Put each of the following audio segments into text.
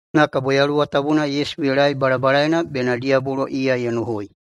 Na kabo Yaluwa Tabuna Yesu ye laei balabalaena bena diyabolo iya ye nohoi.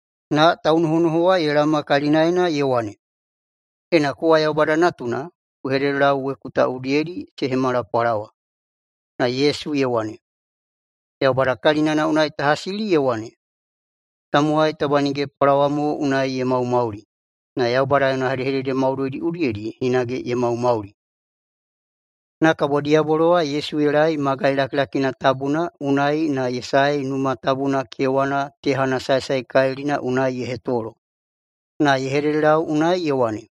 Na taunohonoho wa ye laoma kalinaena ye wane, “Ena kowa Yaubada Natuna, ku hededelau weku ta udiyedi se hemala pwalawa.” Na Yesu ye wane, “Yaubada kalinana unai ta hasili ye wane, ‘Tamowai taba nige pwalawa mo unai ye maumauli, na Yaubada yona hedehedede maudoidi udiyedi hinage ye maumauli.’” Na kabo diyabolo wa Yesu ye laei magai lakilakina tabuna unai na ye saei Numa Tabuna kewana tehana saesaekalilina unai ye hetolo, na ye hededelau unai ye wane,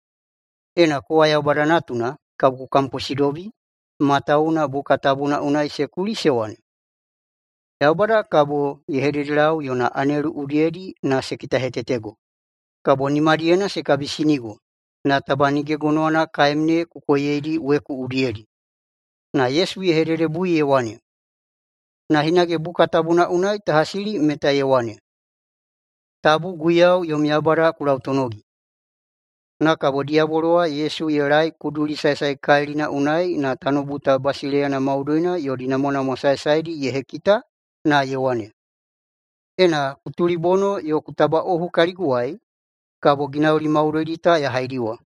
“Ena kowa Yaubada Natuna, kabo ku kamposidobi. Matawuwuna buka tabuna unai se kuli se wane, ‘Yaubada kabo ye hededelau yona anelu udiyedi na se kitahetetego, kabo nimadiyena se kabisinigo, na taba nige gonowana kaem ne ku koiyedi weku udiyedi.’” Na Yesu ye hededebui ye wane, “Na hinage buka tabuna unai ta hasili meta ye wane, ‘Tabu Guiyau yom Yaubada ku lautonogi.’” Na kabo diyabolo wa Yesu ye laei kuduli saesaekalilina unai na tanoubu ta basileiyana maudoidi yodi namwanamwa saesaedi ye hekita na ye wane, “Ena ku tulibono yo ku tabaꞌohu kaliguwai, kabo ginauli maudoidi ta ya haidiwa.”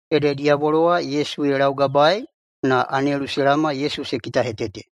Ede diyabolo wa Yesu ye laugabaei, na anelu se laoma Yesu se kitahetete.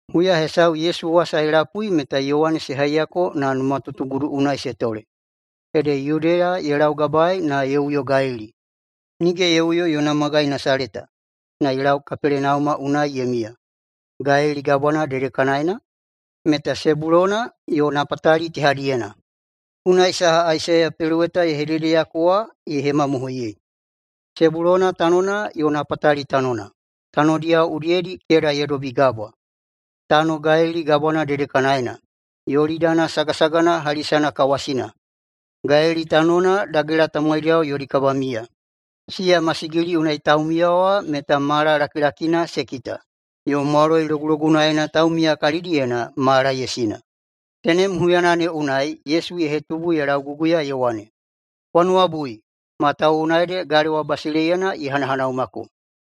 Huya hesau Yesu wasa ye lapui meta Yowane se haiyako na numatutugudu unai se tole. Ede Yudeya ye laugabaei na ye uyo Galili. Nige ye uyo yona magai Nasaleta, na ye lau Kapelenauma unai ye miya, Galili Gabwana dedekanaena, meta Sebulona yo Napatali tehadiyena. Unai saha Aisaiya peloweta ye hededeyako wa ye hemamohoiyei: “Sebulona tanona yo Napatali tanona, tanodiyao udiyedi keda ye dobi gabwa, tano Galili Gabwana dedekanaena, Yolidani sagasagana hali sanakawasina, Galili tanona dagela tamowaidiyao yodi kabamiya, siya masigili unai taumiya wa meta mala lakilakina se kita, yo mwaloi logulogunaena taumiya kalidiyena mala ye sina.” Tenem huyana ne unai Yesu ye hetubu ye lauguguya ye wane, “Kwa nuwabui, matawuwuna ede galewa basileiyana ye hanahanaumako.”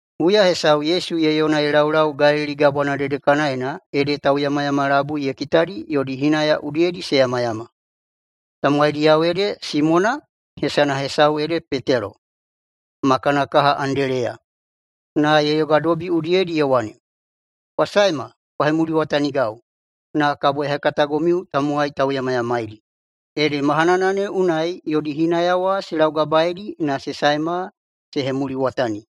Huya hesau Yesu ye yona ye laulau Galili Gabwana dedekanaena ede tauyamayama labui ye kitadi yodi hinaya udiyedi se yamayama. Tamowaidiyao ede Simona – hesana hesau ede Petelo – ma kana kaha Andeleya. Na ye yogadobi udiyedi ye wane, “Kwa saema kwa hemuliwatanigau, na kabo ya hekatagomiu tamowai tauyamayamaidi.” Ede mahanana ne unai yodi hinaya wa se laugabaeidi na se saema se hemuliwatani.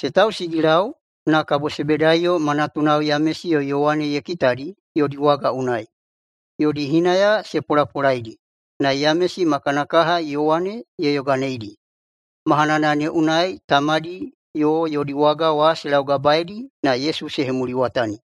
Se tausigilau, na kabo Sebedaiyo ma natunao Yamesi yo Yowane ye kitadi yodi waga unai, yodi hinaya se polapolaidi. Na Yamesi ma kana kaha Yowane ye yoganeidi. Mahanana ne unai tamadi yo yodi waga wa se laugabaeidi, na Yesu se hemuliwatani.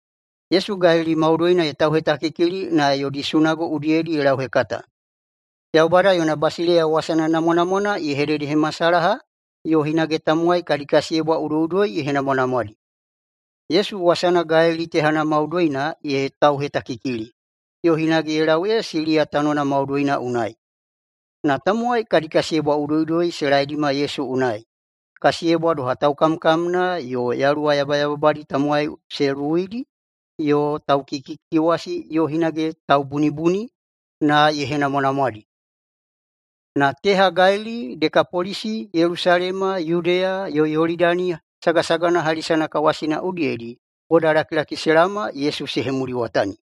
Yesu Galili maudoina ye tauhetakikili na yodi sunago udiyedi ye lauhekata. Yaubada yona basileiya wasana namwanamwana ye hededehemasalaha, yo hinage tamowai kadi kasiyebwa udoiꞌudoi ye henamwanamwadi. Yesu wasana Galili tehana maudoina ye tauhetakikili, yo hinage ye lau ee Siliya tanona maudoina unai. Na tamowai kadi kasiyebwa udoiꞌudoi se laedima Yesu unai, kasiyebwa doha taukamkamna, yo yaluwa yabayababadi tamowai se luwuidi, yo taukikikikiwasi, yo hinage taubunibuni, na ye henamwanamwadi. Na teha Galili, Dekapolisi, Yelusalema, Yudeya, yo Yolidani sagasagana hali sanakawasina udiyedi bodalakilaki se laoma Yesu se hemuliwatani.